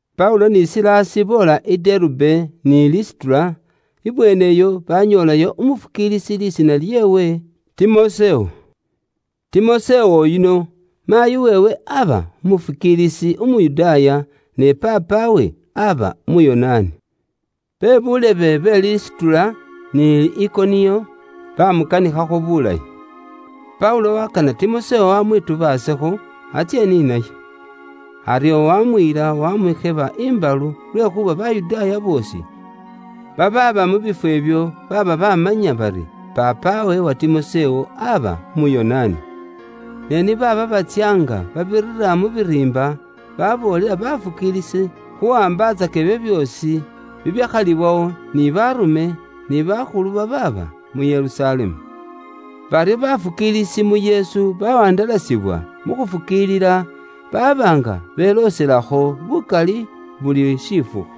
Paulo ni Silasi boola i Derube ni Lisitura, ibweeneyo baanyoolayo umuleekelwa lisiina lyeewe Timosewo. Timosewo yuno, maayi weewe aba umufukiilisi Umuyudaaya, ne paapawe aba Umuyonaani. Bebuulebe be Lisitura ni Ikoniyo baamukanikhakho bulayi. Paulo waakana Timosewo amwitubaasekho, atsye ni naye. Aryo waamuyila waamusheba imbalu lwekhuuba Bayudaaya boosi babaaba mu bifwo ibyo baaba baamanya bari paapawe wa Timosewo aba Umuyonaani. Ne ni baaba batsya nga babira mu biriimba, baboolela bafukiilisi khuwaambatsaka ibyo byoosi bibyakhalibwawo ni Baarume, ni bakhulu babaaba mu Yerusalemu. Baryo bafukiilisi mu Yesu bawandalasibwa mu khufukiilila, baba nga belooselakho bukali buli shifukhu.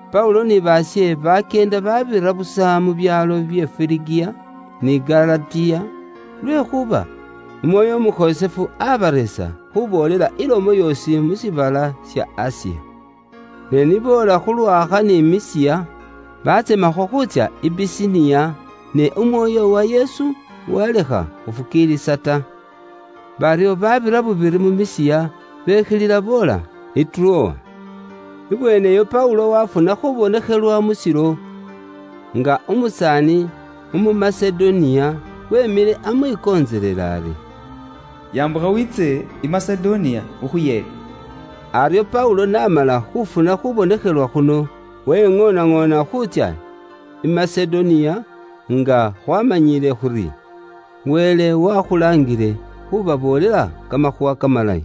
Paulo ni baashe bakyeenda baabira busa mu byaalo bye Firigiya, ni Galatiya, lwekhuuba Umwoyo Umukhosefu aabareesa khuuboolela ilomo yoosi mu shiibala sha Asiya. Ne ni boola khu lwaakha ni Misiya, baatsemakho khuutsya i Bisiniya, ne Umwoyo wa Yesu waalekha khufukiilisa ta. Baryo baabira bubiri mu Misiya, bekhilila boola i Turowa. Ibweeneyo Paulo waafuna khuubonekhelwa mu shilo, nga umusaani umu Masedoniya weemile amwikontselela ari, “Yambukha wiitse i Masedoniya, ukhuyeete.” Aryo Paulo n'amala khuufuna khuubonekhelwa khuno, weŋoonaŋoona khuutsya i Masedoniya, nga khwaamanyile khuri, Wele waakhulaangile khubaboolela Kamakhuuwa Kamalayi.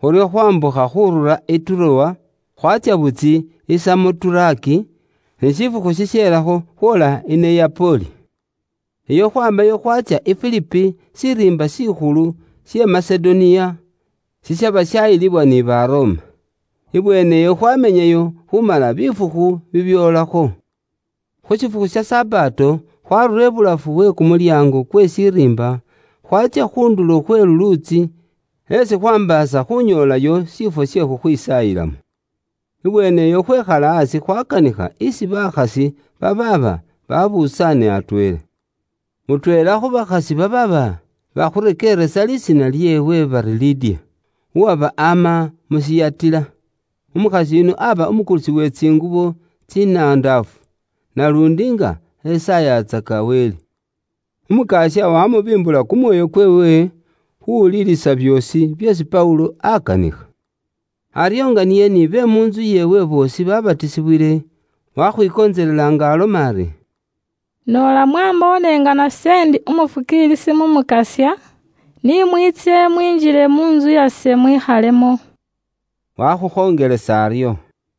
Khuryo khwambukha khurura i Turowa, khwaatsya butysi i Samoturake, ni shifukhu shishelakho khwoola i Neyapoli. Iyo khwaamayo khwaatsya i Filipi, shiriimba shikhulu she Masedoniya, shishaba shaayilibwa ni Baroma. Ibweeneyo khwamenyayo khuumala bifukhu bibyoolakho. Khu shifukhu sha Sabato, khwaarura ibulafu we kumulyaango kwe shiriimba, khwatsya khu ndulo khwe luluutsi, esi khwaambaasa khunyoolayo shifwo she khuloombelamo. Ibweeneyo khwekhala aasi khwakanikha isi bakhasi, babaaba babusaane atweela. Mutweela khu bakhasi babaaba bakhurekeeresa lisiina lyeewe aba Lidiya, uwaba ama mu Siyatila. Umukhasi yuno aba umukulisi we tsingubo tsinandaafu, naluundi nga esaayatsaka Wele. Umukasya wamubimbula kumwoyo kweewe, khuwulilisa byoosi byeesi Paulo akanikha. Aryo nga niye nibe mu ntsu yeewe boosi babatisibwile, wakhwikontselela nga aloma ari, “Noola mwamboone nga nase ndi umufukiilisi mu Mukasya, ni mwiitse mwinjile mu ntsu yase mwikhalemo.” Wakhukhonjelesa aryo.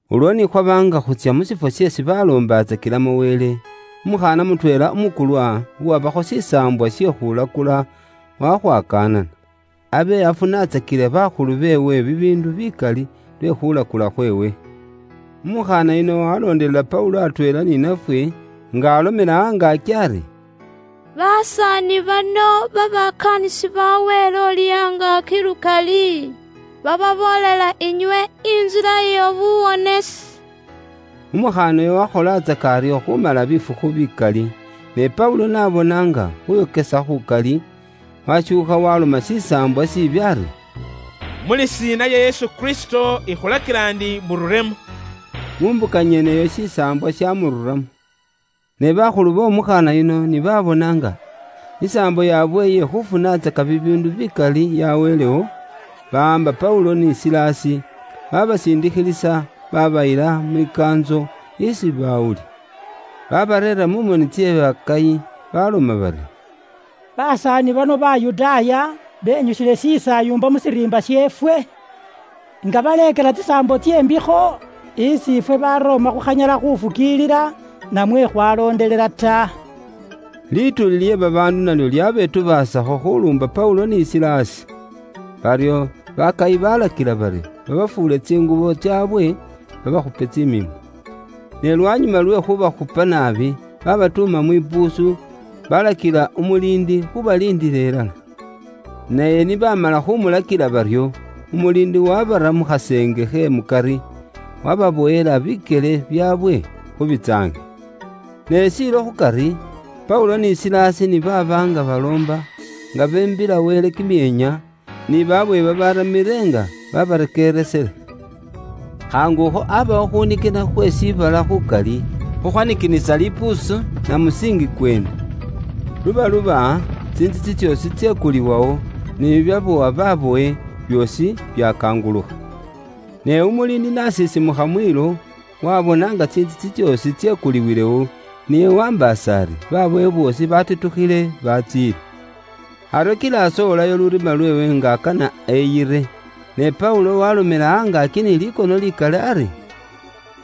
Ulwo ni khwaba nga khutsya mu shifwo esi baloombatsakilamo Wele, umukhaana mutweela umukulwa, uwabakho shisaambwa she khuulakula wakhwakanana, abe afunatsakila bakhulu beewe bibiindu bikali lwe khuulakula khweewe. Umukhaana yuno walondelela Paulo atweela ni nafwe, nga alomela angaaki ari, “Basaani bano babakaanisi ba Wele Uuli Angaaki lukali, bababoolela inywe intsila ye buwonesi.” Umukhaana uyo wakholatsaka aryo khumala bifukhu bikali. Ne Paulo n'abona nga khuyokesa khukali, washuukha waaloma shisaambwa shiibi ari, “Mu lisiina lya Yesu Kristo, ikhulakila ndi mururemo.” Mu mbuka nyeneyo shisaambwa shamururamo. Ne bakhulu b'omukhaana yuno ni baabona nga isaambo yaabwe iye khufunatsaka bibiindu bikali yaweelewo, bawaamba Paulo ni Silasi, babasindikhilisa, babayila mwikaantso isi bawuli. Baabareera mu moni tse baakayi, baloma bari, “Basaani bano Bayudaaya benyusile shisaayumba mu shiriimba sheefwe, nga baleekela tsisaambo tse mbikho, isi ifwe Baroma khukhanyala khufukiilila namwe khwalondelela ta.” Lituuli lye babaandu nalyo lyabetubaasakho khuluumba Paulo ni Silasi. Baryo bakayi balakila bari babafuule tsingubo tsaabwe, babaakhupe tsimiimbo. Ne lwanyuma lwe khubakhupa naabi, babatuuma mwipuusu, balakila umuliindi khubaliindila ilala. Naye ni baamala khumulakila baryo, umuliindi wabara mu khaseenge khe mukari, wababowela bikyele byaabwe khu bitsaangi. Ne shiilo khukari, Paulo ni Silasi ni baaba nga baloomba, nga beembila Wele kimyeenya, ni babowe babaramile nga babarekeeresile. Khaangukho aabawo khunikina khwe shiibala khukali, khukhwanikinisa lipuusu na musiinji kweene. Lubaluba, tsintsitsi tsoosi tsekuliwawo, ni kiminyololo kikyaba khu buli mubowe kyakangulukha. Ne umuliindi n'asisimukha mwiilo, waabona nga tsintsitsi tsoosi tsekuliwilewo, niye waambaasa ari babowe boosi baatitukhile batsiile. Aryo kila asowolayo lurima lweewe nga akana eyire. Ne Paulo waalomela angaaki ni likono likali ari,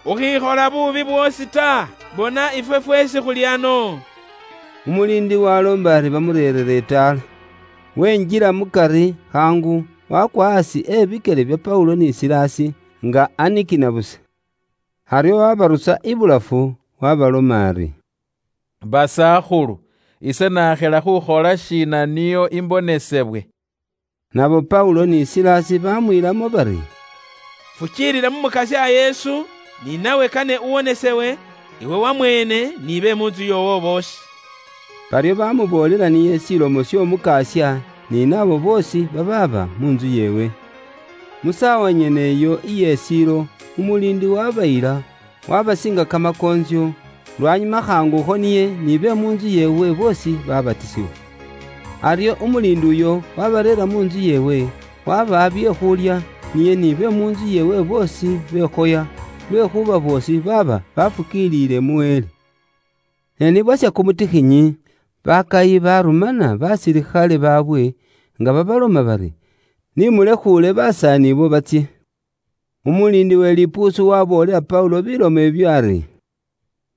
“Ukhikhola buubi bwoosi ta! Bona ifwe fweesi khuli ano.” Umuliindi waaloomba ari bamureerere itaala. Wenjila mukari khaangu, wakwa aasi e bikyele bya Paulo ni Silasi, nga nanikina busa. Aryo wabarusa ibulafu, waabaloma ari, “Basakhulu, ise nakhila khukhola shiina nio imbonesebwe.” Nabo Paulo ni Silasi baamwiilamo bari, “Fukiilila mu Mukasya Yesu, ni nawe kane uwonesewe, iwe wamweene atweela ni be mu ntsu yoowo boosi.” Baryo baamuboolela niye Ilomo y'Omukasya, ni naabo boosi babaaba mu ntsu yeewe. Mu saawa nyene iyo iye shiilo, umuliindi waabayila, waabasiinga kamakoontsyo, lwanyuma khaangukho niye ni be mu ntsu yeewe boosi baabatisibwa. Aryo umuliindi uyo waabareera mu ntsu yeewe, waabawa bye khuulya, niye ni be mu ntsu yeewe boosi bekhoya, lwekhuuba boosi baaba baafukiilile mu Wele. Ne ni bwasha kumutikhinyi, baakayi baarumana baasilikhale baabwe, nga babaloma bari, “Ni mulekhuule basaani abo batsye.” Umuliindi we lipuusu waaboolela Paulo bilomo ibyo ari,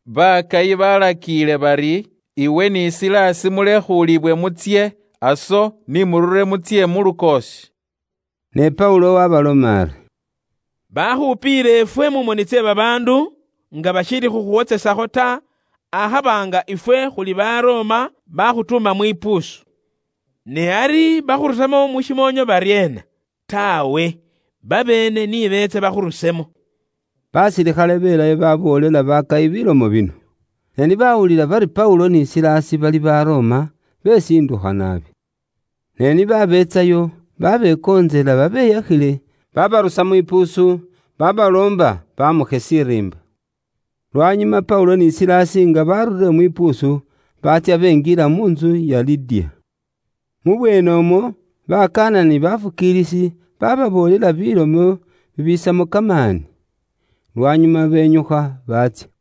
“Baakayi baalakiile bari, iwe ni Silasi, mulekhuulibwe mutsye. Aso, ni murure, mutsye mu lukoosi.” Ne Paulo waabaloma ari, “Baakhupiile ifwe mu moni tse babaandu, nga bashiili khukhuwotsesakho ta, akhaba nga ifwe khuli Baroma, baakhutuuma mwipuusu. Ne ari bakhurusamo mu shimoonyo baryeena? Taawe, babeene ni beetse bakhurusemo.” Baasilikhale abo beelayo baaboolela baakayi bilomo bino. Ne ni baawulila bari Paulo ni Silasi bali Baroma, beesindukha naabi. Ne baabeetsayo, baabekontselela babeyakhile, baabarusa mwipuusu, baabaloomba baamukhe shiriimba. Lwanyuma Paulo ni Silasi nga baarurire mwipuusu, baatsya benjila mu ntsu ya Lidiya. Mubweenemwo, baakanana ni baafukiilisi, baababoolela bilomo bibisamo kamaani. Lwanyuma benyukha baatsya.